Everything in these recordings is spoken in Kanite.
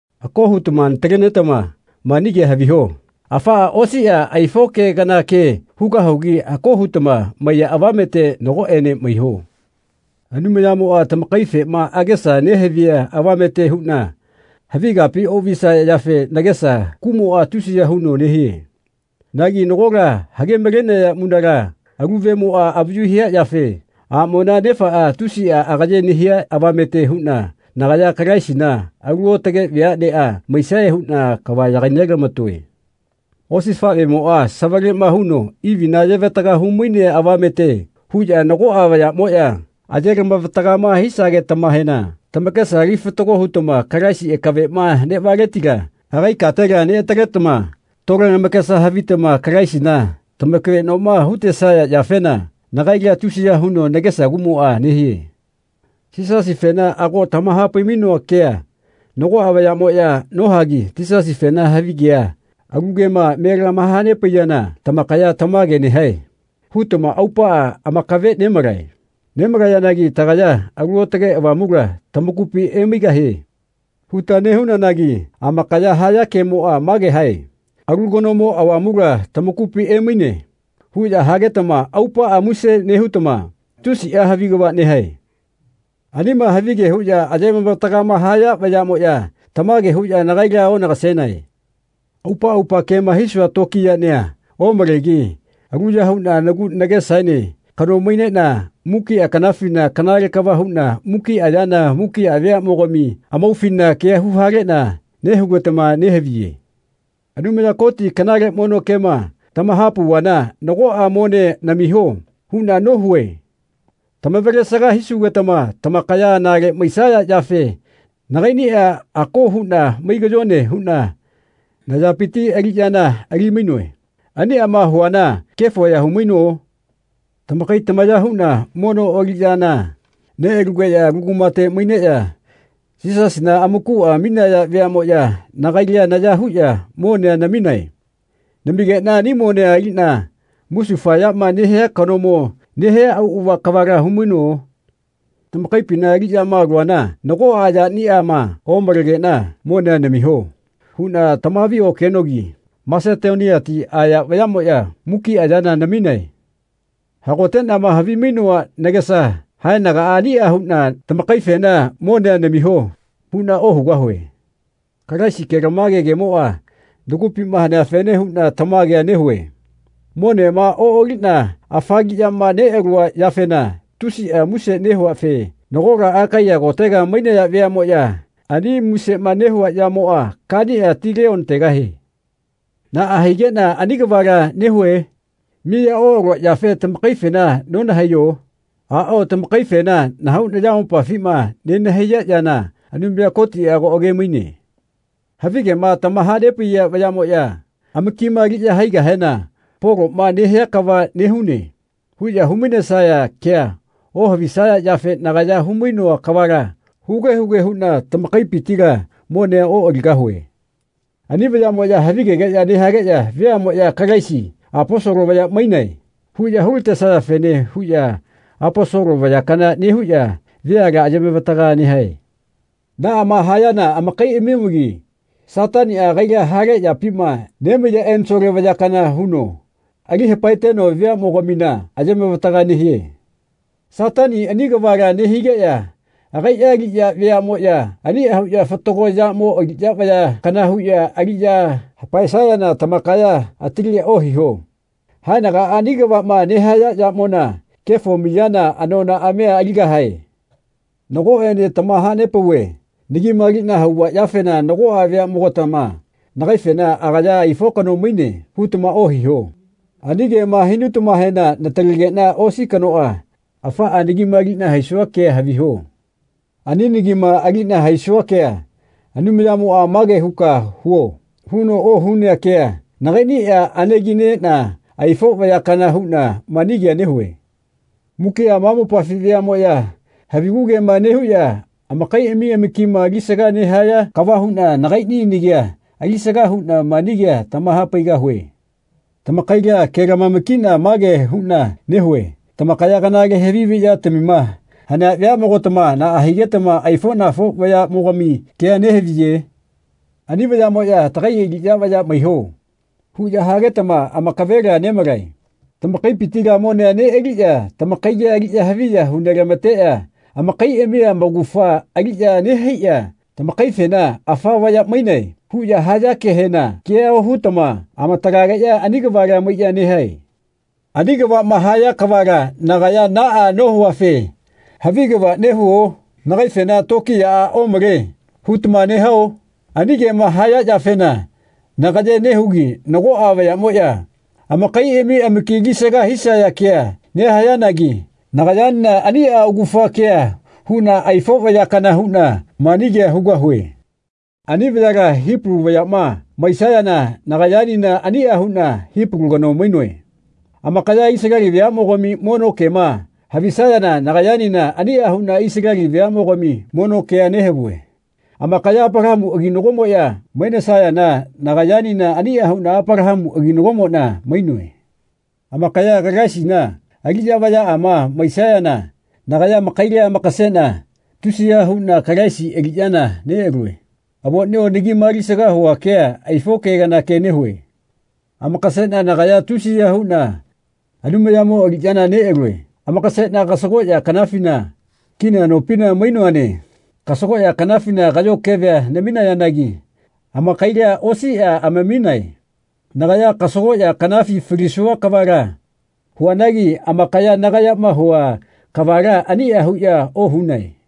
Ako hutama natalenetama mani kea haviho. Afaꞌa osiꞌa aifo ke kana ke hugahugi ako hutama maiya avamete nagoꞌene maiho. Anumayamoꞌa tamakaifema agesa nehavia avamete huꞌna havi kapi oꞌvisaya yafe nagesa kuꞌmoꞌa tusiya huno nehie. Nagi nagola hage-malenea munala alu vemoꞌa avayu hia yafe aꞌmona nefaꞌa tusiꞌa agaye nehia avamete huꞌna nagaya Kalaisina alu aotage veaꞌneꞌa maisae huꞌna kava yagainelamatoe. Osifaꞌvemoꞌa savaleꞌma huno Ivina ayevataga humainea avamete huꞌya nagoꞌa vayaꞌmoꞌya ayelama-vatagama hisagetamahena tamakesa ali fatago hutama Kalaisi akaveꞌma neꞌvaletila agai katela neꞌataletama tole lamakesa havitama Kalaisina tamakaveꞌnoma hutesaya yafena nagaila tusiya huno nagesa kuꞌmoꞌa nehie. Yisasifena ago tamahapai-mainoa kea nagoꞌa vayaꞌmoꞌya nohagi Yisasifena havigea alu kema me lamahanepaiyana tamakaya “Tamage nehae.” hutama aupaꞌa amakave nemalae. Nemalayanagi tagaya “Alu Aotage Avamula tamakupi emaigahie.” huta nehunanagi amakaya haya kemoꞌa mage hae “Alu kanomo avamula tamakupi emaine.” huꞌya hagetama aupaꞌa muse nehutama tusiꞌa havi kava nehae. Anima havige huꞌya ayemavataga haya vayaꞌmoya tamage huꞌya nagaila onagasenae. Aupa aupa kema hisua tokiyaꞌnia omalegi aluya huꞌna nagu nagesaene kano maineꞌna mukiꞌa kanafina kanale kava huꞌna mukiꞌa yana mukiꞌa veaꞌmogami amaufina kea huhaleꞌna nehugetama nehaviye. Anumaya Koti kanale mono kema tamahapauvana “Nagoꞌa monea namiho.” huꞌna ohunoe. Tamavalesaga hisugetama tamakaya anale maisaya yafe nagaiꞌnia ako huꞌna mai kayone huꞌna nayapiti aliꞌyana ali-mainoe. Aniꞌama huana kefo ya humaino? Tamakai tamaya huꞌna mono aliꞌyana neꞌalugeꞌya alu kumate maineꞌya Yisasina amakuꞌa aminaya veaꞌmoꞌya nagaila naya huꞌya monea naminae. Namigeꞌna ani monea aliꞌna musufayama nehia kanomo nehia auꞌava kavala humaino? Tamakaipina aliꞌyama aluana nagoꞌa yaniꞌama omalegeꞌna “Monea namiho.” huꞌna tamahaviokenogi Masetoniati aya vayaꞌmoꞌya mukiꞌa yana naminae. Hagoteꞌnama havimainoa nagesa haenagaꞌa aniꞌa huꞌna tamakaifena “Monea namiho.” huꞌna ohugahue. Kalaisi kelamage kemoꞌa nagupima haneafene huꞌna tamagea nehue. Monema oꞌaliꞌna afa aliꞌyama neꞌalua yafena tusiꞌa muse nehuafe nagola Akaiya kotega mainaya veaꞌmoꞌya ani musema nehua yamoꞌa kaniꞌa tileonategahae. Naꞌa higeꞌna ani kavala nehue? Miya oꞌalua yafe tamakaifena nonahaiyo? Aꞌao tamakaifena nahau nayamopafima nenahaiya yana Anumaya Kotiꞌa ago age-maine. Havigema tamahanepaiya vayaꞌmoꞌya amakima aliꞌya haigahena “Poloꞌma nehia kava nehune.” huꞌya hu-mainesaya kea ohavisaya yafe nagaya humainoa kavala huge huge huꞌna tamakaipitila monea oꞌaligahue. Ani vayaꞌmoꞌya havigegeꞌya nehageꞌya veaꞌmoꞌya “Kalaisi Aposolo vaya mainae.” huꞌya hulatesayafene huꞌya Aposolo vaya kana nehuꞌya veala ayemavataga nehae. Naꞌama hayana amakaiꞌami-omagi Sataniꞌa agaiꞌa hale yapima nemaiya ensole vaya kana huno ali hapaeteno veaꞌmogamina ayemavataga nehie. Satani ani kavala nehigeꞌya agaiꞌa aliꞌya vayaꞌmoꞌya aniꞌa huꞌya fatago yamo aliꞌya vaya kana huꞌya aliꞌya hapaesayana tamakaya atalia ohiho. Haenagaꞌa ani kavaꞌma nehaya yamona kefo miyana anonaꞌamia aligahae. Nagoꞌene tamahanepauve nagima aliꞌna hauva yafena nagoꞌa veaꞌmogatama nagaifena “Agaya aifo kano maine.” hutama ohiho. Ani kema hinutamahena natalegeꞌna osi kanoꞌa afaꞌa nagima aliꞌna haisua kea haviho. Ani nagima aliꞌna haisua kea Anumayamoꞌa “Mage huka huo.” huno ohunea kea nagaiꞌniꞌa anegi neꞌna aifo vaya kana huꞌna mani kea nehue. Mukiꞌa ma mopafi veaꞌmoꞌya havigu kema nehuꞌya amakaiꞌami amakima alisaga nehaya kava huꞌna nagaiꞌni nagia alisaga huꞌna mani kea tamahapaigahue. Tamakaila kelamama-kiꞌna mage huꞌna nehue tamakaya kanale havi haviꞌyatamima hanea veaꞌmogatama naꞌa higetama aifoꞌnafo vayaꞌmogami kea nehaviye? Ani vayaꞌmoꞌya “Tagai aliꞌya vaya maiho.” huꞌya hagetama amakavela nemalae. Tamakaipitila monea neꞌaliꞌya tamakaila aliꞌya haviya hu nelamateꞌya amakaiꞌami amaugafa aliꞌya nehaiꞌya tamakaifena “Afa vaya mainae.” huꞌya haya kehena kea ohutama amatalageꞌya ani kavala maiꞌya nehae. Ani kavaꞌma haya kavala nagaya naꞌa nohuafe havi kava nehuo? Nagaifena “Tokiyaꞌa omale.” hutama nehao? Ani kema haya yafena nagayea nehugi nagoꞌa vayaꞌmoꞌya amakaiꞌami amaki alisaga hisaya kea nehayanagi nagayaenena aniꞌa augafa kea huꞌna aifo vaya kana huꞌna mani kea hugahue. Ani vayala Hipalu vayaꞌma maisayana nagayaenena aniꞌa huꞌna Hipalu kano mainoe. Amakaya Isaleli veaꞌmogami mono kema havisayana nagayaenena aniꞌa huꞌna Isaleli veaꞌmogami mono kea nehavue. Amakaya Apalahamu aginagomoꞌya mainesayana nagayaenena aniꞌa huꞌna Apalahamu aginagomoꞌna mainoe. Amakaya Kalaisina aliꞌya vayaꞌama mainesayana nagaya amakaila amakaseꞌna tusiya huꞌna Kalaisi aliꞌyana neꞌalue. Avoꞌnio nagima alisaga hua kea aifo ke kana ke nehue. Amakaseꞌna nagaya tusiya huꞌna Anumayamo aliꞌyana neꞌalue. Amakaseꞌna kasagoꞌya kanafina kina nopina mainoane. Kasagoꞌya kanafina kaꞌyo kevea naminayanagi amakaila osiꞌa amaminae. Nagaya kasagoꞌya kanafi falisua kavala huanagi amakaya nagayama hua kavala aniꞌa huꞌya ohunae.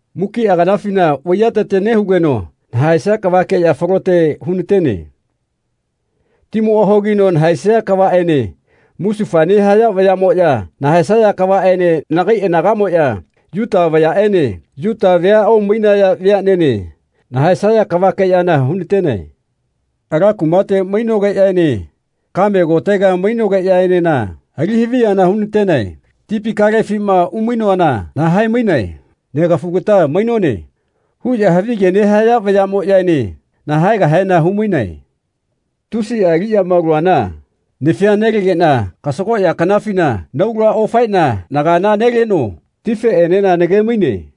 Mukiꞌa kanafina vaiyatete nehugeno nahaesia kavakeꞌya falote hunatene. Timoꞌa hogino nahaesia kavaꞌene musufaya nehaya vayaꞌmoꞌya nahaesaya kavaꞌene nagai anagaꞌmoꞌya, Yuta vayaꞌene, Yuta vea omainaya vayaꞌene nahaesaya kavakeꞌyana hunatenae. Ala kumate mainogeꞌyaene kaꞌme kotega mainogeꞌyaenena ali haviyana hunatenae. Tipi kalefima umainoana nahae-mainae. “Negafugata mainone.” huꞌya havige nehaya vayaꞌmoꞌyaene nahaegahena humainae. Tusiꞌa aliꞌyama aluana nafia nelegeꞌna kasagoꞌya kanafina naula ofaeꞌna nagala neleno tifeꞌenena nage-maine.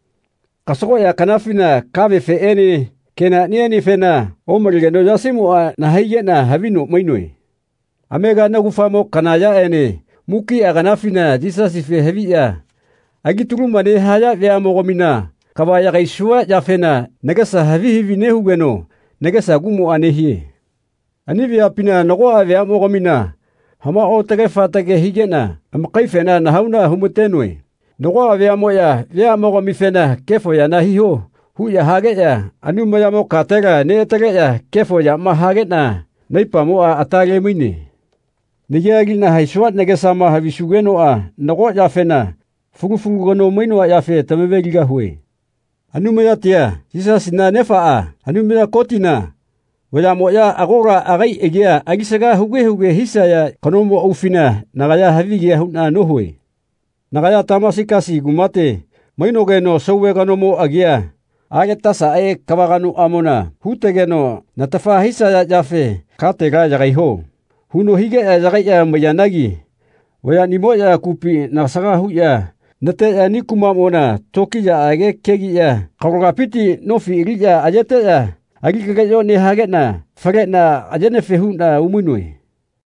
Kasagoꞌya kanafina kavefeꞌene kenaꞌnienefena omalegeno yasimoꞌa nahaigeꞌna havi no mainoe. Amega naugafamo kana yaꞌene mukiꞌa kanafina Yisasife haviꞌya elitaluma nehaya veaꞌmogamina kava yagaisua yafena nagesa havi havi nehugeno nagesa kuꞌmoꞌa nehie. Ani veapina nagoꞌa veaꞌmogamina hamao otage fatage higeꞌna amakaifena nahauna humatenoe. Nagoꞌa veaꞌmoꞌya veaꞌmogamifena “Kefo yana hiho” huꞌya hageꞌya Anumayamo katela neꞌataleꞌya kefo yama hageꞌna naipamoꞌa ata lemaine. Nagia aliꞌna haisua nagesama havisugenoꞌa nago yafena fulu fulu kano mainoa yafe tamave-ligahue. Anumayatia, Yisasina Nefaꞌa, Anumaya Kotina, vayaꞌmoꞌya agola agai agia alisaga huge huge hisaya kanomo aufina nagaya havigea huꞌna nohue. Nagaya Tamasigasi kumate mainogeno sauve kanomo agia Aletasaꞌe kava kanoꞌamona hutegeno natafa hisaya yafe “Katela yagaiho.” huno higeꞌya yagaiꞌya maiyanagi vayaꞌnimoꞌya kupi nasaga huꞌya nateꞌya ani kumaꞌmona tokiyaꞌage kegiꞌya akalogapiti nofi aliꞌya ayeteꞌya ali kaleꞌyo nehageꞌna faleꞌna ayenefe huꞌna umainoe.